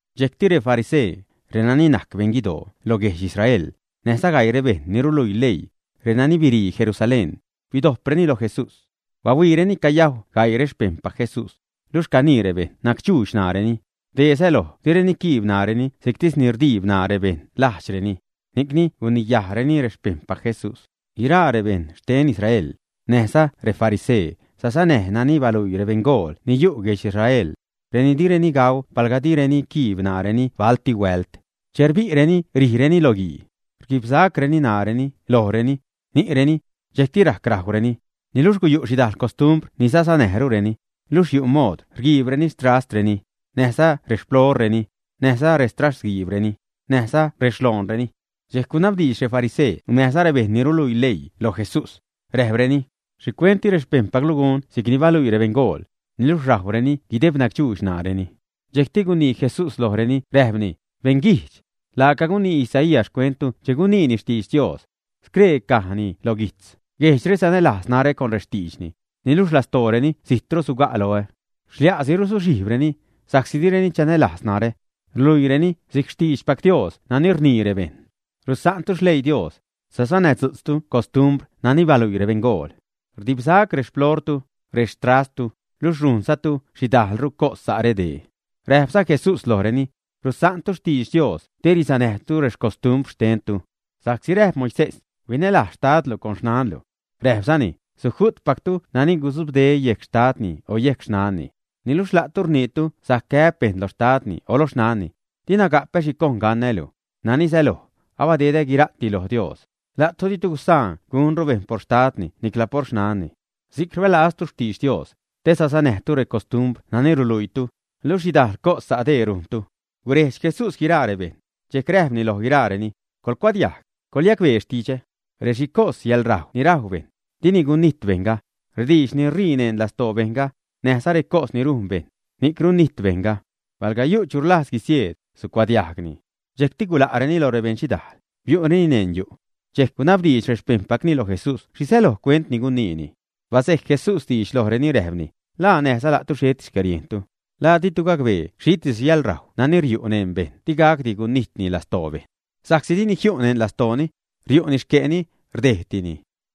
Dxejcti refarisee, renani najc beṉguidoo loj guedx Israel, näjza gaii rebejṉ ni ruluii leii, renani birii Jerusalén, bidojpreni loj Jesús. Bahuiireni cayajw gaii rexpejṉpac Jesús, luxh canii rebejṉ nacdxuudx naareni (dee säloj direni quiib ṉaareni si'ctis ni rdiib ṉaa rebeṉ lajdxreni). Ni'cni guniyajreni rexpejṉpac Jesús. (Guiraa rebejṉ xten Israel, näjza refarisee, sasanäj nani baluii rebeṉgool ni yu' guedx Israelreni. Direni gauu palga direni quiib ṉaareni balti huält. Che rbi'reni rijreni lo guii, rguibsa'creni ṉaareni, lojreni, ni'reni, dxejcti rajc rajwreni. Niluxh guyu' xhidajl costumbr ni sasanäjrureni, luxh yu' mood rguiibreni rextrastreni näjza rexplooreni, näjza rextrastguiibreni, näjza rexloonreni.) Dxejc gunabdiidx refarisee näjza rebejṉ ni ruluii leii loj Jesús, räjpreni: ―¿Xhicuent di rexpejṉpaclu gun si'cni baluii rebeṉgool, niluxh rajwreni guideb nacdxuudx ṉaareni? Dxejcti gunii Jesús lojreni räjpni: ―¡Beṉ guijdx! Laaca gunii Isaías xcuenttu che guniini xtidx Dios. Scree cajni loj guijtz: Guejdxre sanälajz narä con rextiidxni, niluxh lastooreni zitro suga' loä. Xlia'si ruzuxhijbreni, sa'csi direni chanälajz narä. Ruluiireni si'c xtiidxpac Dios nani rnii rebejṉ. Rusa'ntu xleii Dios, sasanädzu'tztu costumbr nani baluii rebeṉgool. Rdibsa'c rexploortu, rextrasttu, luxh rujnzatu xhidajlru cos sa' redee. Räjpza Jesús lojreni: ―Rusa'ntu xtidx Dios te risanäjtu recostumbr xtentu. Sa'csi räjp Moisés: “Huinälajz xtadlu con xnanlu.” Räjpzani: “Suju'tpactu nani gudzubde yejc xtadni o yejc xnanni.” Niluxh la'tu rniitu sajc gäb bejṉ loj xtadni o loj xnanni: “Dina gapä xhi cojn gacnää́lu” (nani säloj, abadedä guira'ti loj Dios). La'tu ditu gusaan gunru bejṉ por xtadni nicla por xnanni. Si'c rbälaztu xtidx Dios, te sasanäjtu recostumbr nani ruluiitu, luxh xhidajl cos sa' dee rujntu. Gurejdx Jesús guiraa rebejṉ, dxejc räjpni loj guiraareni: ―Colcuadiajg, coḻyacbee xtidxä. Rexhicos yäḻrajw ni rajw bejṉ, dini gunijt bejṉga, rediidx ni ṟii neṉ lastoo bejṉ, näjza recos ni rujn bejṉ, ni'c runijt bejṉga. Pal yu' chu rlajz guisieed, sucuadiajgni. Dxejcti gula'reni loj rebeṉxhidaal, biu'reni neṉ yu'. Dxejc gunabdiidx rexpejṉpacni loj Jesús xhi säloj cuent ni guniini. Basejc Jesús diidx lojreni, räjpni: ―¿La näjza la'tu xheti xcäriejntu? ¿La di'tu gacbee xhitis yäḻrajw nani riu' neṉ bejṉ digacdi gunijtni lastoo bejṉ, ä? Sa'csi dini jiu' neṉ lastooni; riu'ni xque'ni, rdejdtini.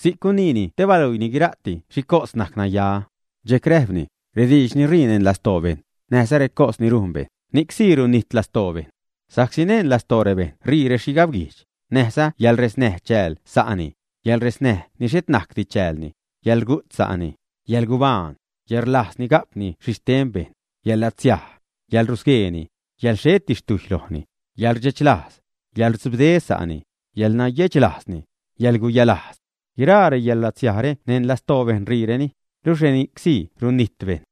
Si'c guniini te baluiini guira'ti xhicos najc naya. Dxejc räjpni: ―Rediidx ni ṟii neṉ lastoo bejṉ, näjza recos ni rujn bejṉ, ni'c sii runijt lastoo bejṉ. Sa'csi neṉ lastoo rebejṉ ṟii rexhigabguijdx, näjza yäḻresnäj chääl sa'ni, yäḻresnäj ni xhet najcdi chäälni, yäḻrugu't sa'ni, yäḻgubaan, yäḻrlajzni ga'pni xhixhten bejṉ, yäḻlatsiaj, yäḻrusgueeni, yäḻ xheti xtujy lojni, yäḻrdxechlajz, yäḻrudzubde sa'ni, yäḻnayechlajzni, yäḻguyalajz. Guiraa reyäḻlatsiajre neṉ lastoo bejṉ ṟiireni, luxh reni'csi runijt bejṉ.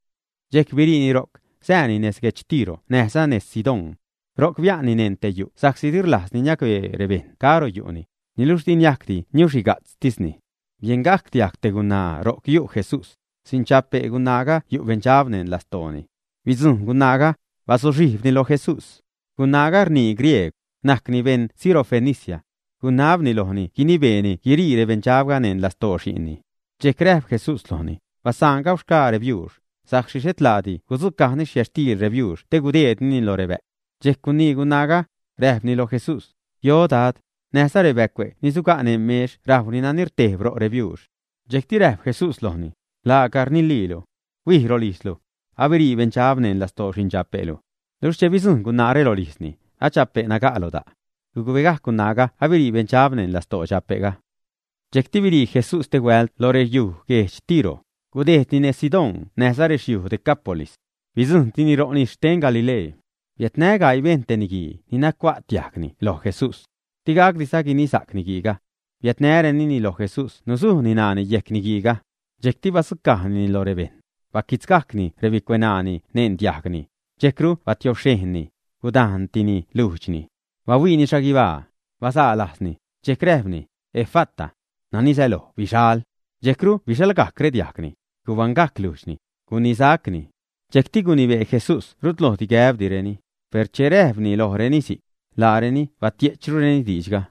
Dxejc biriini ro'c, sääni nez guedx Tiro näjza nez Sidón. Ro'c bia'nni neṉ te yu' sa'csi di rlajzni niacbee rebejṉ caro yu'ni, niluxh di niajcdi niuxhiga'tztisni. Biengajc diajg te gunaa ro'c yu' Jesús. Xindxape' gunaaga yu' beṉdxab neṉ lastooni. Bidzujṉ gunaaga, bazuxhijbni lo Jesús. Gunaaga rnii griegw, najcni beṉ Sirofenicia. Gunabni lojni guinibeeni guirii beṉdxabga neṉ lastoo xi'nni. Dxejc räjp Jesús lojni: ―Basaan gauxgaa rebiuux, sa'csi xhet laati gudzucajni xcuxtiil rebiuux te gudeednini loj rebä'cw. Dxejc gunii gunaaga, räjpni loj Jesús: ―Yo, Dad. Näjza rebäcue' ni suga' neṉ mex rajw nani rtejb ro' rebiuux. Dxejcti räjp Jesús lojni: ―Laaca rniliilu. Huij rolijzlu. Abirii beṉdxab neṉ lastoo xindxape'lu. Luxh che bidzujṉ gunaare rolijzni, a dxape' naga' lo da'. Gucbegajc gunaaga abirii beṉdxab neṉ lastoo dxape'ga. Dxejcru birii Jesús stehuält lo rexyuj guedx Tiro, gudejdni nez Sidón näjza rexyuj Decápolis. Bidzujṉtini ro' nis xten Galilee. Biädnä gaii bejṉ te niguii ni nacua't diajgni lo Jesús. Digacdiza guinisa'c niguiiga. Biädnabreni lo Jesús nusujni ṉaani yejc niguiiga. Dxejcti badzucajnini loj rebejṉ. Baquitzgajcni rebicueṉaani neṉ diajgni, dxejcru batiobxhejnni, gudajntini lujdxni. Bahuiini xhaguibaa, bazaa lajzni, dxejc räjpni: ―¡Efata! ―nani säloj bixal. Dxejcru bixalgajc rediajgni, gubaṉgajc lujdxni, gunisa'cni. Dxejcti gunibee Jesús rutlojdi gäbreni, per che räjpni lojreni si'c, laareni batie'chrureni diidxga.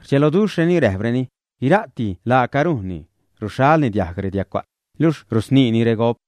Rdxeloduxhreni, räjpreni: ―Guira'ti laaca rujnni; ruxhalni diajg rediagcua't, luxh rusniini regop.